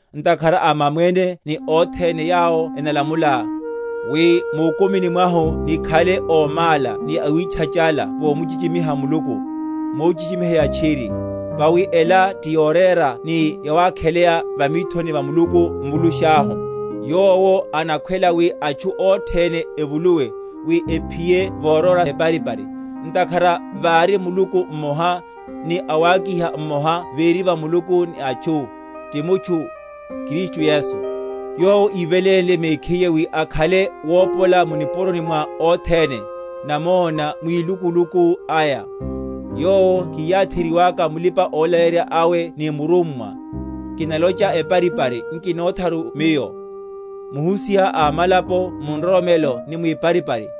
ntakhara a mamwene ni othene yawo enalamulela; wi mukumini mwahu nikhale ómála ni awitchachala vomuchichimiha Muluku, mochichimiheya tchiri. Vawi ela ti yorera ni yawakheleya va mithoni va Muluku Mvulusháhu: Yowo anakhwela wi atchu othene evuluwe, wi ephiye voróra eparipari. Ntakhara vari Muluku mmoha, ni awakiha mmoha véri va Muluku ni atchu, ti mutchu, Kristu Yesu. Yowo ívelénle mekhiye wi akhale wopola mu nipuroni mwa othene; namona mwilukuluku aya; yowo kiyátheryiwaka mulipa‐olaleyerya awe ni murummwa (kinalocha eparipari, nkinotharu miyo), muhusiha a amalapo mu nroromelo ni mwiparipari.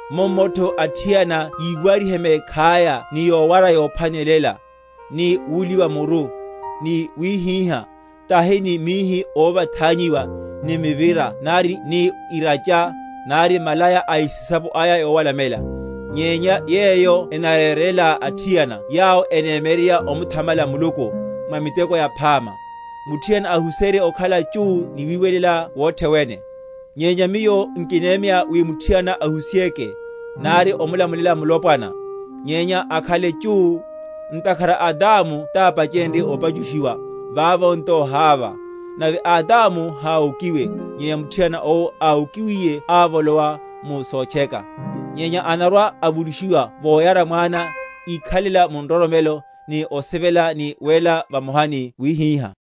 Mummotho, athiana yiwarihe mekhaya ni yowara yophwanela, ni wuliwa muru, ni wíhíha; tahi ni mihi óvathanyiwa, ni mivira nari ni iracho, nari malaya a esisapo aya yowalamela; nyenya (yeyo enarerela athiana yawo enemyeryerya omuthamala Muluku), mwa miteko yaphama. Muthiana ahuserye okhala chú ni wiwelela wothe wene. Nyenya miyo nkinemya wi muthiana ahusiheke, nari omulamulela mulopwana; nyenya akhaleke chú. Ntakhara Adamu tápachenrye opachushiwa, vavo nto Hava; nave Adamu háwokiwe, nyenya muthiana owo áwokiwiye avolowa mu sotcheka; nyenya anarwa‐avulushiwa voyara mwana, íkhalela mu nroromelo ni osivela ni wéla vamoha ni wíhíha.